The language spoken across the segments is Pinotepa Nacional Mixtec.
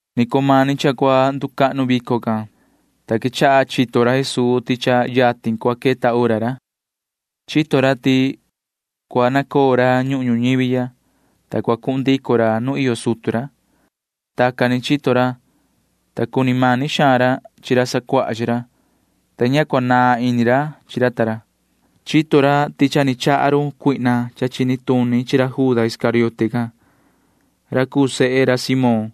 Ni vii cumani cha cua nducahnu vico can, ta quechaha chito ra Jesuu ti cha yatin cua queta hora ra. Chito ra ti cua nacoo ra ñuhun ñuñivi ya, ta cua cuhun ndico ra nu iyo sutu ra. Tacan ni chito ra, ta cuni mani xaan ra chi ra sacuaha chi ra, ta ña cua cahnda ini ra chi ra ta ra. Chito ra ti cha ni chaha run cuihna cha chini tuni chi ra Juda Iscariote can ra cuu sehe ra Simón,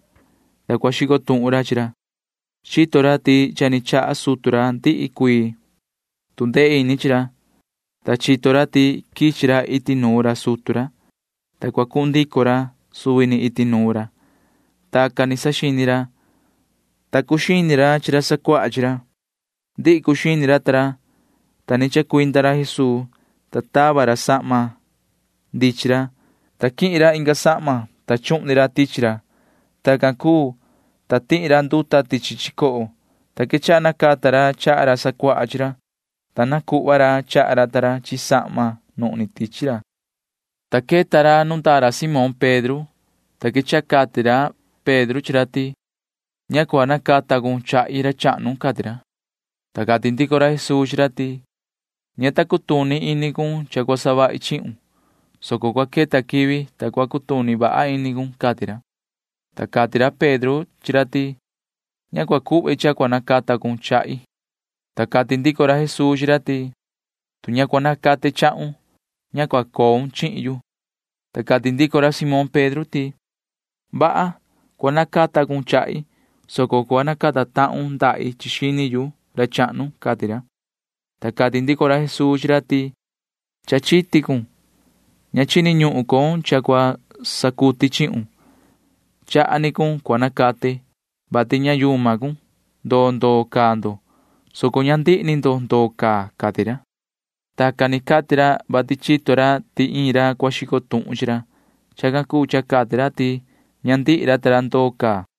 ta cua xico tuhun ra chi ra. Chito ra ti cha ni chaha sutu ra ndihi cuii tu ndee ini chi ra, ta chito ra ti quichi ra iti nuun ra sutu ra, ta cua cuhun ndico ra suvi ni iti nuun ra. Tacan ni saxini ra, ta cuxini ra chi ra sacuaha chi ra. Ndihi cuxini ra ta ra, ta ni chacuinda ra Jesuu, ta tava ra sahma ndichin ra, ta quihin ra inga sahma, ta chuhni ra tichi ra. Tacan cuu, ta tihi ra nduta tichi chicoho, ta quechaha nacata ra chaha ra sacuaha chi ra, ta nacuhva ra chaha ra chi sahma nuhni tichi ra. Ta queta ra nu ndecu ra Simón Pedro, ta quechaha cati ra Pedro chi ra ti: ―Ña cua nacata tahun chahi, ra chahnu ―cati ra. Ta cati ndico ra Jesuu chi ra ti: ―Ña ta cutuni ini cun cha cua savahi chihun, soco cua queta quivi, ta cua cutuni vaha ini cun ―cati ra. Ta cati ra Pedro chi ra ti: ―Ña chahi cha cua nacata cun chahi. Ta cati ndico ra Jesuu chi ra ti: ―Tu ña cua nacate chahun, ña cua coun chihin yu. Ta cati ndico ra Simón Pedro ti: ―Vaha. Cua nacata cun chahi, soco cua nacata tahun ndahi chi xini, ra chahnu ―cati ra. Ta cati ndico ra Jesuu chi ra ti: ―Cha chiti cun. Ña chini ñuhun con cha cua sacuti chihun. Chaha ni cun cua nacate, vati ña yuma cun. Ndoo ndoo iyo ndo, soco ña ndihi ni ndo iyo tacan ―cati ra. Tacan ni cati ra Jesuu, vati chito ra ti iin ra cua xico tuhun chi ra. Chacan cuu cha cati ra ti ña ndihi ra iyo ndoo.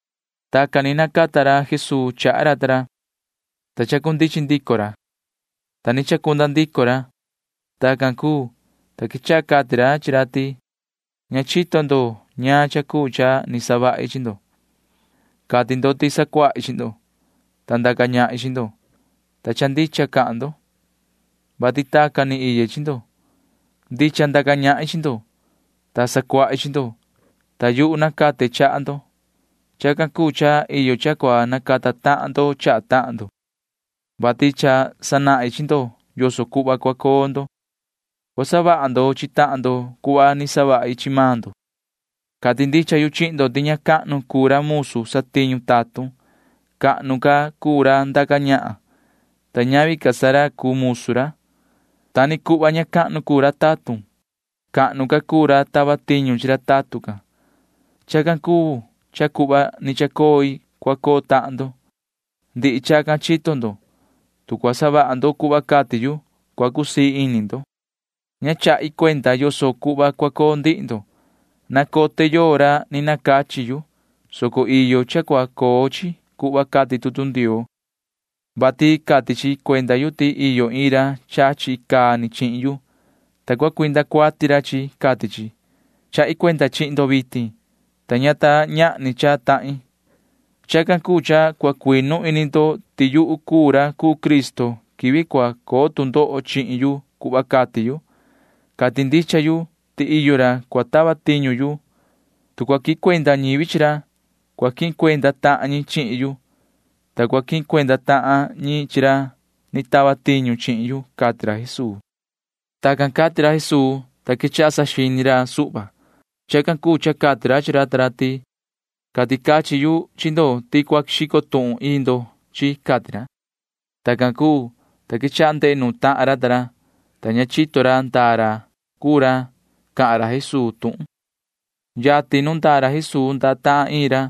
Tacan ni nacata ra Jesuu chaha ra ta ra, ta chacundichin ndico ra, ta ni chacunda ndico ra. Tacan cuu, ta quechaha cati ra chi ra ti: ―Ña chito ndo ñaan cha cuu cha ni savahi chi ndo. Cati ndo ti sacuahi chi ndo, ta ndaca ñahin chi ndo, ta cha ndicha cahan ndo, vati tacan ni iye chi ndo. Ndicha ndaca ñahin chi ndo, ta sacuahi chi ndo, ta yuhu nacate chaha ndo. Chacan cuu cha iyo cha cua nacata tahan ndo chaha tahan ndo, vati cha sanahin chi ndo yoso cuhva cua coo ndo. Cua savaha ndo chi tahan ndo cuhva ni savahi chi maan ndo. Cati ndicha yu chihin ndo ti ña cahnu cuu ra satiñu tatun, soco cahnu ca cuu ra ndaca ñahan, ta ñavi ca sa ra cuu tatun ra. Ta ni cuhva ña cahnu cuu ra tatun, soco cahnu ca cuu ra tava tiñu chi ra tatun can. [Chacan cuu cha cuhva ni chacoi cua coo tahan maan ndo.] Ndihi chacan chito ndo. Tu cua savaha ndo cuhva cati yu, cua cusii ini ndo. ’Ña chahi cuenda yoso cuhva cua coo ndihi ndo. Nacote yoo ra ni nacachi yu, soco iyo cha cua coo chi cuhva cati tutu Ndioo, vati cati chi cuenda yu ti iyo ra chachi chihin yu icaa ni, ta cua savaha ra ndavaha ni chihin yu, cati chi. Chahi cuenda chihin ndo vitin, ta ña ta ñahni cha ni tahin. Chacan cuu cha cua cuinu ini ndo ti yuhu cuu ra cuu Cristo quivi cua coo tu ndoho chihin yu cuhva cati yu. Cati ndicha yu ti iyo ra cua tava tiñu yu. Tu cua quihin cuenda ñivi chi ra, cua quihin cuenda tahan ñi chihin yu, ta cua quihin cuenda tahan ñi chi ra ni tava tiñu chihin yu ―cati ra Jesuu. Tacan cati ra Jesuu, ta quechaha saxini ra suhva. Chacan cuu cha cati ra chi ra ta ra ti: ―Cati cachin yu chi ndo ti iin ndo cua xico tuhun chihin yu ―cati ra. Tacan cuu, ta quechaha ndehe ra ta ra chi tahan ra, ta ña chito ra ndaa ra cuu ra cahan Jesuu tuhun can. Yatin nu ndecu ra Jesuu ndecu tahan iin ra,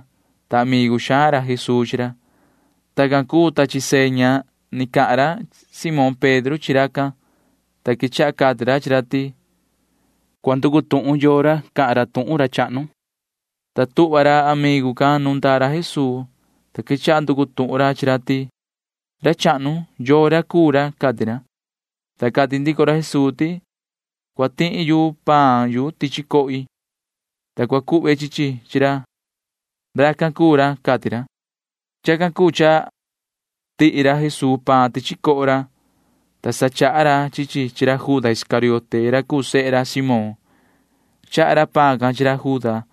ta amigu xaan ra Jesuu chi ra. Tacan cuu, ta sandaha ra Simón Pedro chi racan, ta quechaha cati ra chi ra ti: ―Cua nducu tuhun cun yoo ra cuu ra cahan ra chahnu. Tacan sa ni tuhva ra amigu can suhva ca nu ndecu ra Jesuu, ta quechaha nducu tuhun ra chi ra ti: ―Ra chahnu, ¿yoo ra cuu ra? ―cati ra. Ta cati ndico ra Jesuu ti: ―Cua tihi yu paan yu tichi cohi, ta cua cuhve chi chi chi ra. Racan cuu ra ―cati ra. Chacan cuu cha tihi ra Jesuu paan tichi coho ra, ta sa chaha ra chi chi chi ra Juda Iscariote ra cuu sehe ra Simón. Chaha ra paan can chi ra Juda,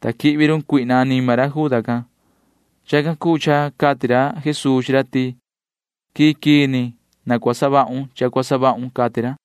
ta sa quihvi run Satanaa anima ra Juda can. Chacan cuu cha cati ra Jesuu chi ra ti: ―Quii quii ni na cua savahun cha cua savahun ―cati ra.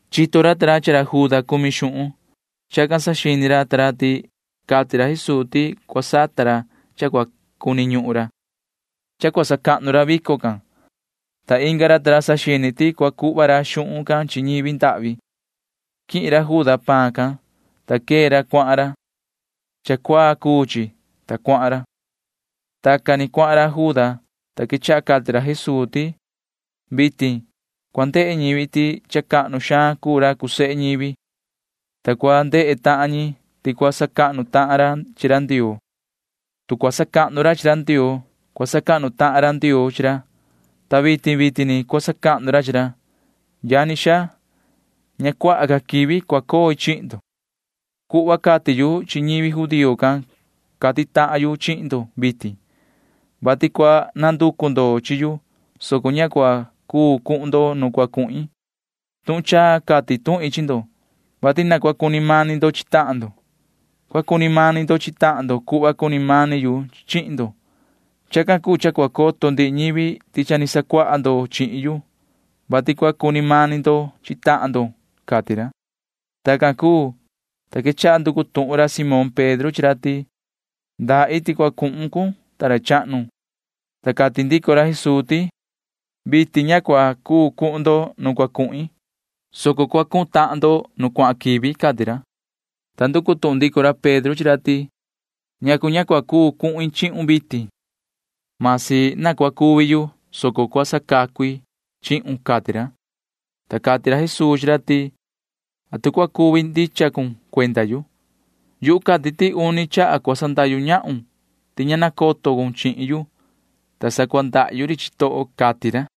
Chito ra ti cumi ra Juda xuhun. Chacan cuu cha iyo ra saxini ra ti cati ra Jesuu ti cua sata ra ñaan cha cua cuni ñuhun ra, ta cua sacahnu ra vico can, ta inga ra saxini ra ti cua cuhva ra xuhun can chi ñivi ndahvi. Quihin ra Juda paan can, ta quee ra. Cuahan ra. Cha cuaa cuu chi, ta cuahan ra. Tacan ni cuahan ra Juda, ta quechaha cati ra Jesuu ti: ―Vitin cua ndehe ñivi ti cha cahnu xaan cuu ra cuu sehe ñivi, ta cua ndehe tahan ñi ti cua sacahnu tahan ra chi ra Ndioo. Tu cua sacahnu ra chi ra Ndioo, cua sacahnu tahan ra Ndioo chi ra, ta vitin vitin ni cua sacahnu ra chi ra. Yani xaa, ña nahan ca cua coi chi ndo. Cuhva ni cati yu chi ñi judío can cati yu chihin ndo vitin, vati cua nanducu ndo chihin yu, soco ña cua cuu cuhun ndo nu cua cuhin. Tuhun chaa cati tuhin chi ndo, vati na cua cuni mani ndo chi tahan ndo. Cua cuni mani ndo chi tahan ndo cuhva cuni mani yu chihin ndo. Chacan cuu cha cua coto ndihi ñivi ti cha ni sacuaha ndo chihin yu, vati cua cuni mani ndo chi tahan ndo ―cati ra. Tacan cuu, ta quechaha nducu tuhun ra Simón Pedro chi ra ti: ―¿Ndaa iti cua cuhun, ta ra chahnu? Ta cati ndico ra Jesuu ti: ―Vitin ña cua cuu cuhun ndo nu cua cuhin, soco cua cuhun tahan ndo nu cuahan quivi ―cati ra. Ta nducu tuhun ndico ra Pedro chi ra ti: ―¿Ñacu ña cua cuu cuhin chihun vitin? Masi na cuvi yu, soco cua sacacu i chihun ―cati ra. Ta cati ra Jesuu chi ra ti: ―¿Atu cua cuvi ndicha cun cuenda yu? Yu cati ti uni chaha cua sandahyu ñahun ti ña nacoto cun chihin yu, ta sa cua ndahyu ri chitoho ―cati ra.